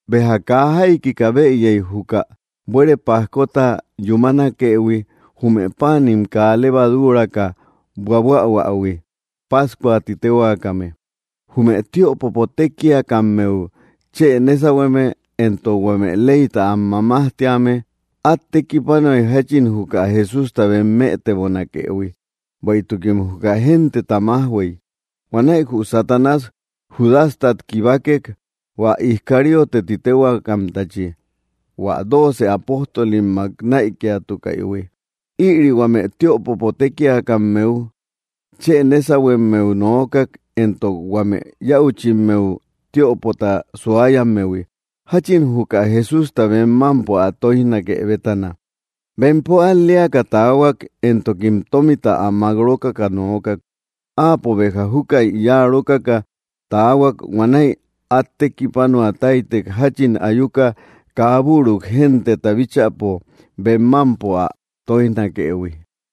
Béja kaa jaikika bëyey juka buere pajkota yúmanakëhui, jume páanim kaa levaduuraka buabuähuähui, pájcua ti téhuaakame. Jume tiöpopo tékiakammeu chë nésahueme, éntok huame leyta am mamajtíame át tekipanuay jáchin juka Jesústa bem mëtebonakëhui, bueïtukim juka genteta májhuey. Huanäi jü Satanás Judastat kibakek, hua Iscariote ti téhuaakamtachi, hua dooce apóstolimmak näikiatukaïhui. Ïri huame tiöpopo tékiakammeu chë nésahuemmeu nookak, éntok huame yäuchimmeu tiöpota suayammehui, jáchin juka Jesústa bem mámpo ä tóijnake bétana. Bempo al‑leaka taahuak, éntokim tómita ä mák rókaka nookak. Áapo béja júkäi yáa rókaka taahuak. Huanäi át tekipanua táytek, jáchin ayuka kaa büru genteta bíchäpo bem mámpo ä tóijnakëhui.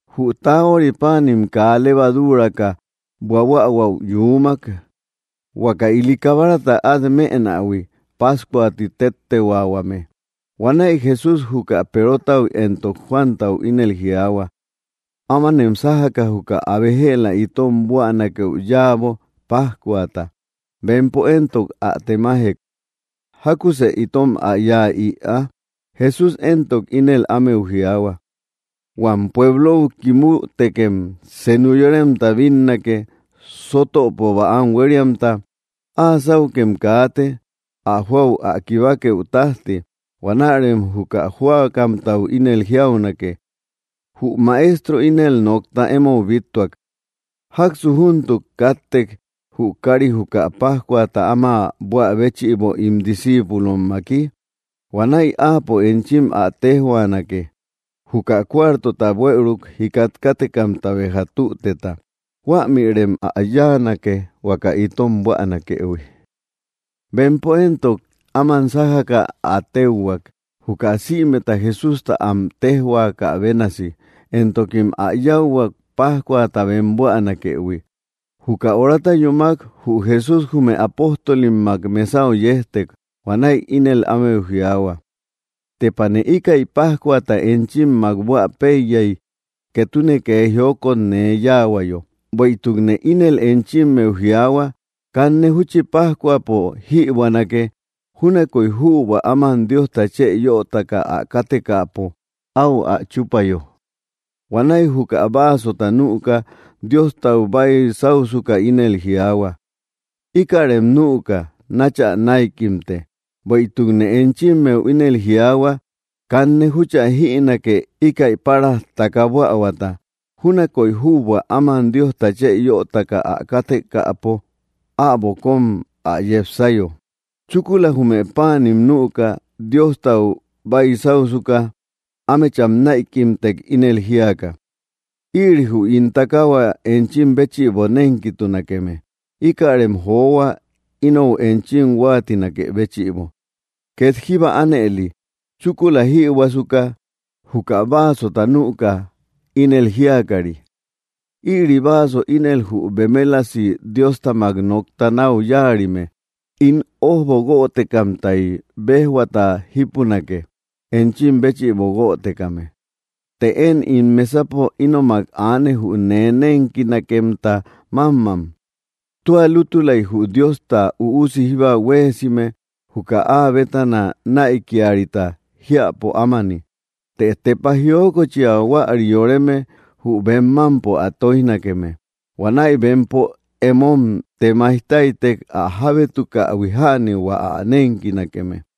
Jü taahuari páanim kaa levaduuraka buabuähuäu yuumak, huaka ili kabarata át mënähui, pájcua ti téttehuaahuame. Huanäi Jesús juka Perotau éntok Juantau ínel jiaahua: —Ámanem sájaka juka abe jëla itom buänakeu yáabo, pájcuata. Bempo éntok ä temajek: —¿Jákusë itom ä yáa ïa? Jesús éntok ínel ámeu jiaahua: —Huam pueblou kimütekem senu yoremta bínnake, sótöpo bäam huériamta. Áa sáukem kaate, ä jóau ä kibakeu tájti. Huanärem jü jóakamtau ínel jiaunake: “Jü Maestro ínel nokta émou bíttuak: ¿Jáksu júntuk káttek, jü káari juka pájcuata áma buä béchïbo ín discíipulommaki?” Huanäi áapo enchim ä téjhuaanake, juka cuartota buëuruk jikat kátekamta béja tüteta. Huämïrem ä yáanake huaka itom buänakëhui. Bempo éntok áman sájaka ä téuhuak, juka sïmeta Jesústa am téjhuakä bénasi, éntokim ä yáuhuak, pájcuata bem buanakëhui. Juka horata yúmak, jü Jesús jume apóstolimmak mesau yejtek. Huanäi ínel ámeu jiaahua: —¡Tepane íkäi pájcuata enchimmak bua péiyay, ketune kee jiokot nee yáahuayo! Bueïtukne ínel enchimmeu jiaahua, kanne júchi pájcuapo jïbuänake, júnakoy jübua áman Diosta chë yötaka ä kátekäpo áu ä chúpayo. Huanäi juka vaasota nüka Diostau baisáusuka ínel jiaahua: —Ikärem nüka nachä näikimte; bueïtukne enchimmeu ínel jiaahua, kanne júchä jïnake, íkäi páraj taka bähuata, júnakoy jübua áman Diosta chë yötaka ä kátekäpo äbo kóm ä yepsayo. Chúkula jume páanim nüka, Diostau baisáusuka, ámecham näikimtek, ínel jíaka: —Ïri jü ín takahua enchim béchïbo nénkitunakeme. Íkärem johua, inou enchim huáatinakë béchïbo. Két jíba ánëli, chúkula jïbuäsuka, juka vaasota nüka, ínel jíakari: —Ïri vaaso ínel jü bemelasi Diostamak nokta náu yáarime; ín ójbo guötekamtay béjhuata jípunake, enchim béchïbo guötekame. ’Të én ín mesapo ínomak aane, jü nee nénkinakemta mámmam. Tua lútulay jü Diosta Üusi jíba huéesime juka áa bétana näikiarita jiäpo ámani; ¡të tepa jiokochia huäri yoreme jü bem mámpo ä tóijnakeme! Huanäi bempo emom temaij táytek, ä jábétukähui jäni hua ä nénkinakeme.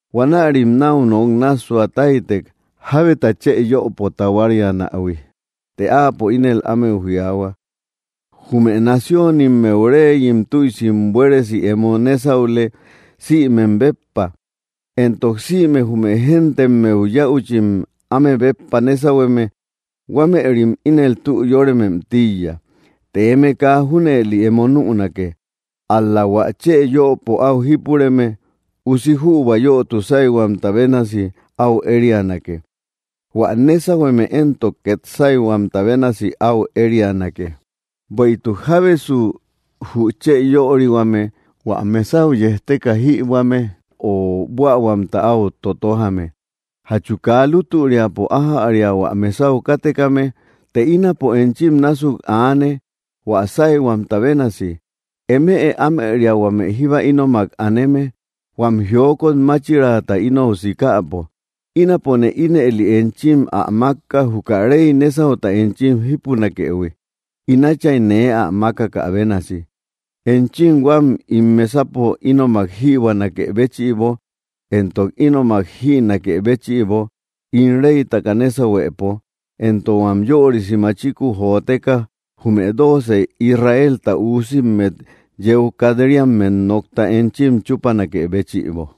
Huanärim náu nok nássua táytek, jábeta chë yöpo tahuarianähui. Të áapo ínel ámeu jiaahua: —Jume naciónimmeu reyim tüisim buéresi emo nésaule sïmem béppa, éntok sïme jume géntemmeu yäuchim áme béppa nésahueme, huamerim ínel tü yóremem tíiya. Të eme kaa junëli emo nünake. Ál‑la hua chë yöpo áu jípureme, usi jübua yötu sáyhuamta bénasi áu érianake; hua nésahueme éntok, két sáyhuamta bénasi áu érianake. Bueïtuk, ¿jábesu jü chë yörihuame, hua mesau yejteka jïbuäme, o buähuamta áu totojame? ¿Jachu kaa lútüriapo ájäria hua mesau kátekame? Të ínapo enchim násuk aane, hua sáyhuamta bénasi. ’Eme ámëria huame jíba ínomak aneme, huam jiokot máchiraata inou sikäpo. Ínapone ínëli enchim ä mákka, juka rey nésauta enchim jípunakëhui, ín Átchay nee ä mákakä bénasi, enchim huam ín mesapo ínomak jïbuanakë béchïbo éntok ínomak jïnakë béchïbo ín reytaka nésahuepo, éntok huam yörisi machiku joteka jume dooce Israelta üusimmet yeu kat‑riammet nokta enchim chúpanakë béchïbo.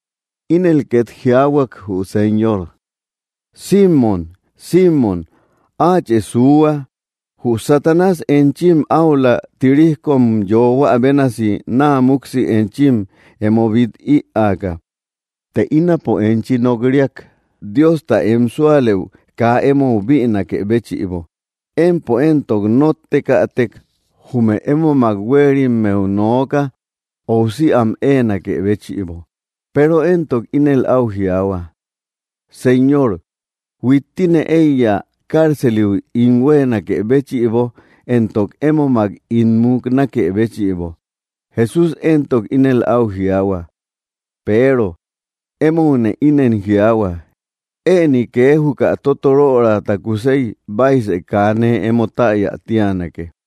Ínel két jiaahuak jü Señor: —¡Símon, Símon, áachë suuhua! Jü Satanás enchim áula, tirijkom yoohuä bénasi naa múksi enchim emo bít ïaaka; të ínapo enchi nok‑riak Diosta em súalëu kaa émou bïnakë béchïbo. Empo éntok nóttekätek, jume émomak huéerimmeu nooka, óusi am éenakë béchïbo. Peero éntok ínel áu jiaahua: —Señor, huittine eiya cárceliu ín huéenakë béchïbo, éntok émomak ín muknakë béchïbo. Jesús éntok ínel áu jiaahua: —Peero, émoune ínen jiaahua, ëni kee juka tótorörata kusey, baisë kaa nee emo täya tíanake.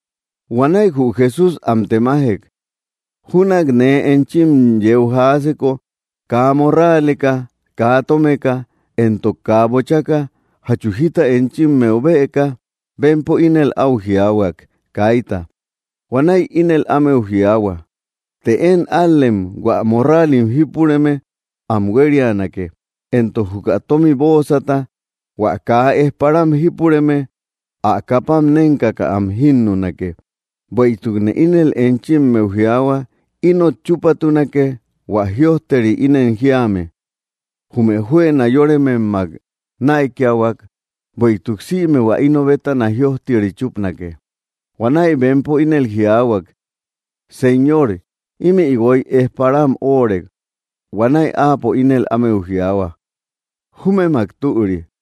Huanäi jü Jesús am temajek: —Júnak nee enchim yeu jaaseko kaa morraaleka, kaa tómeka, éntok kaa bochaka, ¿jachu jita enchimmeu bëka? Bempo ínel au jiaahuak: —Kaita. Huanäi ínel ámeu jiaahua: —Të én ál‑lem hua morraalim jípureme am huérianake, éntok juka tómi bóosata; hua kaa ejparam jípureme ä kapam nénkaka am jínnunake. Bueïtukne ínel enchimmeu jiaahua, inot chúpatunake hua jïojteri ínen jíame: “Jume juëna yórememmak näikiahuak.” Bueïtuk sïme hua ino bétana jïojteri chúpanake. Huanäi bempo ínel jiaahuak: —Señor, ímï guoy ejparam óorek. Huanäi áapo ínel ámeu jiaahua: —Júmemak türi.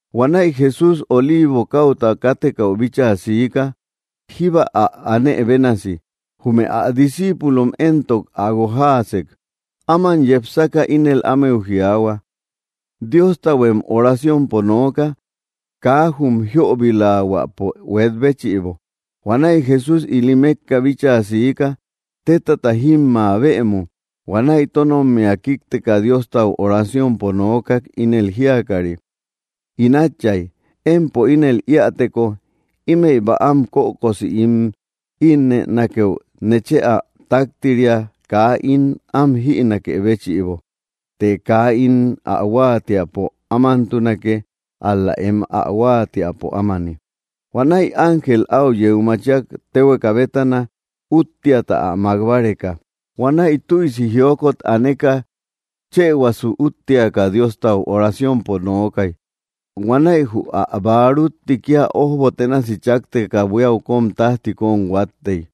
Huanäi Jesús Oliivo káuta kátekäu bíchaa siika, jíba ä aánë bénasi. Jume ä discíipulom éntok ä guojaasek. Áman yepsaka ínel ámeu jiaahua: —Diostahuem oraciompo nooka, kaa jum jiobilahuápo huet béchïbo. Huanäi Jesús ili mékka bíchaa siika, tétata jímmä bëmu. Huanäi tónommia kíkteka, Diostau oraciompo nookak, ínel jíakari: —In Átchay, empo ínel íäteko, ímëi bäam kökosi ín ínnënakeu, nechë ä táktiria kaa ín am jïnakë béchïbo. Të kaa ín ä huáatiäpo ámantunake, ál‑la em ä huáatiäpo ámani. Huanäi ángel áu yeu machiak téhueka bétana, úttiata ä mák báreka. Huanäi tüisi jiokot aneka, chëhuasu úttiaka Diostau oraciompo nookay. Huanäi jü ä bäarútti kía ójbo ténasi chákteka buíau tájti kóm huáttey.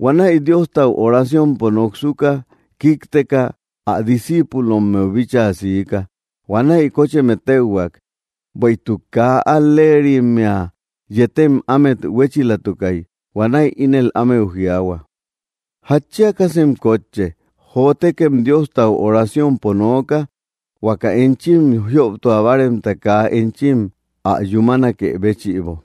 Huanäi Diostau oraciompo noksuka kíkteka, ä discíipulommeu bíchaa siika. Huanäi kócheme téuhuak, bueïtuk kaa al‑leerimmea yetem ámet huéchilatukay. Huanäi ínel ámeu jiaahua: —¿Jatchiakasem kótche? Jotekem, Diostau oraciompo nooka huaka enchim jioptua báaremta kaa enchim ä yúmanakë béchïbo.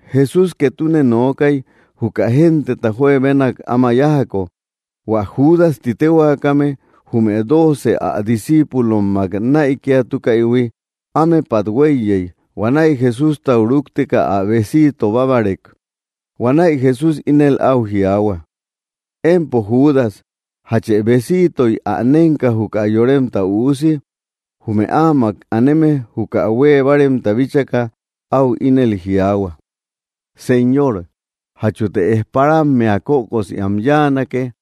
Jesús ketune nookay, juka genteta juebenak áma yájako. Huä Judas ti téhuakame, jume dooce ä discíipulommak näikiatukaïhui, ámepat huéiyey. Huanäi Jesústau rúkteka ä besiito bábarek. Huanäi Jesús ínel áu jiaahua: —Empo Judas, ¿jache besiitoy ä nénka, juka Yoremta Üusi? Jume áamak aneme juka huée báaremta bíchaka, áu ínel jiaahua: —Señor, ¿jachute ejparammea kökosi am yáanake?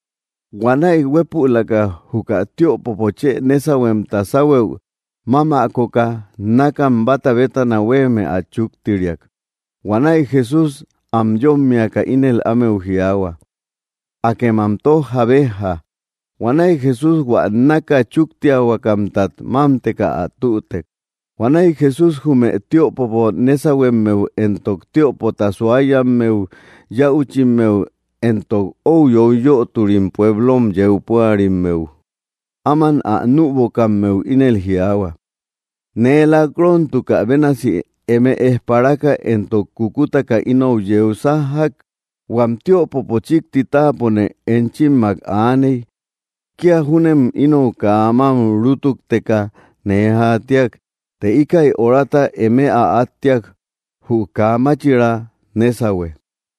Huanäi huépülaka juka tiöpopo chë nésahuemta sáhuëu mámäkoka nákam báta bétana huéeme ä chúktiriak. Huanäi Jesús am yómmiaka ínel ámeu jiaahua: —Akem am tójja, béjja. Huanäi Jesús hua náka chúktiahuakamtat mámteka ä tütek. Huanäi Jesús jume tiöpopo nésahuemmeu éntok tiöpota suayammeu yäuchimmeu, éntok ou yoiyöturim pueblou yeu púarimmeu, áman ä nübokammeu ínel jiaahua: —¿Nee lak‑rontukä bénasi eme ejparaka éntok kúkutaka inou yeu sájjak? Huam tiöpopo chíkti táapone enchimmak aaney. Kía júnem inou kaa mám rútukteka nee jaatiak. Të íkäi horata, eme ä áttiak; jü kaa máchiraa nésahue.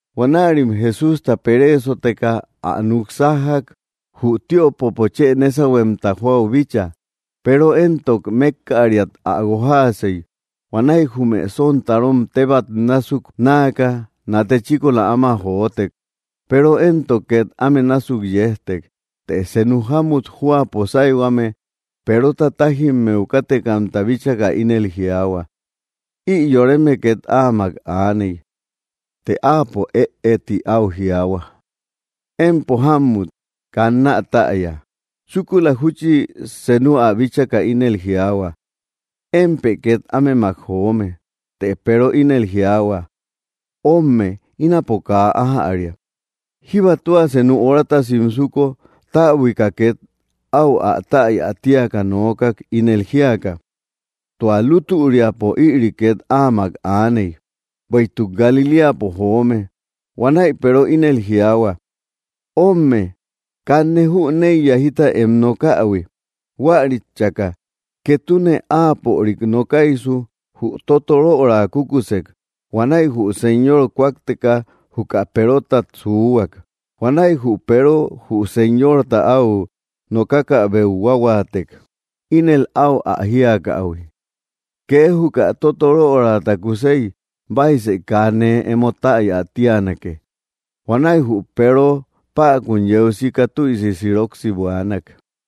Huanärim Jesústa pereesoteka, ä núk sájjak, jü tiöpopo chë nésahuemta jóau bíchaa. Peero éntok mékkäriat ä guojaasey. Huanäi jume sontarom tebat násuk náaka, nate chíkola áma jotek. Peero éntok két áme násuk yejtek. Të senu jámut jóapo sáyhuame, Perota tájimmeu kátekamta bíchaka, ínel jiaahua: —Ï yoreme két áamak aaney. Të áapo “ëe” ti áu jiaahua: —Empo jámmut, kannä täya. Chúkula júchi senu ä bíchaka ínel jiaahua: —Émpë két ámemak joome. Të Peero ínel jiaahua: —Ómme, ínapo kaa ájäria. Jíba tua senu horata simsuko, täbuika két áu ä täya tíaka nookak, ínel jíaka: —Tua lútüriapo ïri két áamak aaney, bueïtuk Galiléapo joome. Huanäi Peero ínel jiaahua: —Ómme, kanne jüneiya jita em nokähui. Huärit chäka, ketune áapörik nokaysu, jü tótoröra kukusek. Huanäi jü Señor kúakteka juka Perotat suuhuak. Huanäi jü Peero jü Señorta áu nokakäubeu huahuaatek, ínel áu ä jíakähui: “Kee juka tótorörata kusey, baisë kaa nee emo täya tíanake.” Huanäi jü Peero päkun yeu sika tüisi siroksi buaanak.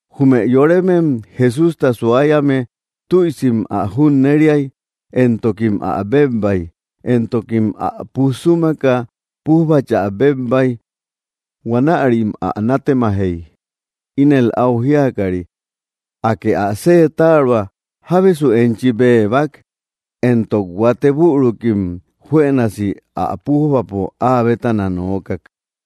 Jume yoremem Jesústa suayame tüisim ä junneriay, éntokim ä bébbay. Éntokim ä puj súmaka, pújbachä bébbay. Huanärim ä nátemajey, ínel áu jíakari: —Akë ä seetaroa, ¿jábesu enchi bébba? Éntok huatek bürukim juënasi ä pújbapo áa bétana nookak.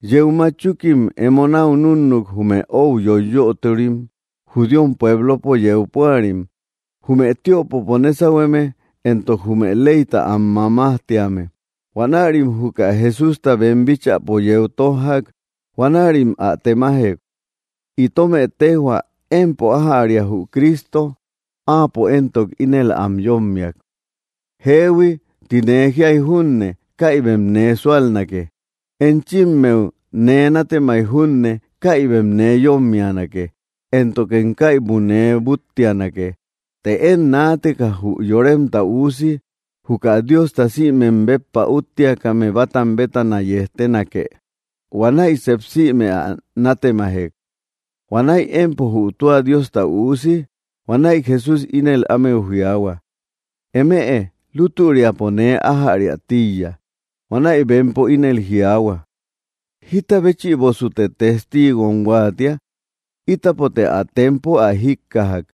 Yeu matchukim emo náu núnnuk, jume ou yoiyöturim judíom pueblopo yeu púari, jume tiöpopo nésahueme, éntok jume leyta am mamajtíame. Huanärim juka Jesústa bem bíchäpo yeu tójjak. Huanärim ä temajek: —Itomë téjhua, ¿empo ájäria jü Cristo? Áapo éntok ínel am yómmiak: —Jeehui ti nee jíay junne, kaibem nee súalnake. Enchimmeu nee nátemay junne, kaibem nee yómmianake, éntokem kaibu nee búttianake. Të én naateka jü Yoremta Üusi juka Diosta sïmem béppa úttiakame bátam bétana yejtenake. Huanäi sep sïme ä nátemajek: —¿Huanäi empo jü tua Diosta Üusi? Huanäi Jesús ínel ámeu jiaahua: —Eme lútüriapo nee ájariä tíiya. Huanäi bempo ínel jiaahua: —¿Jíta béchïbosute testiigom huáatia? Ítapote ä tempo ä jíkkajak.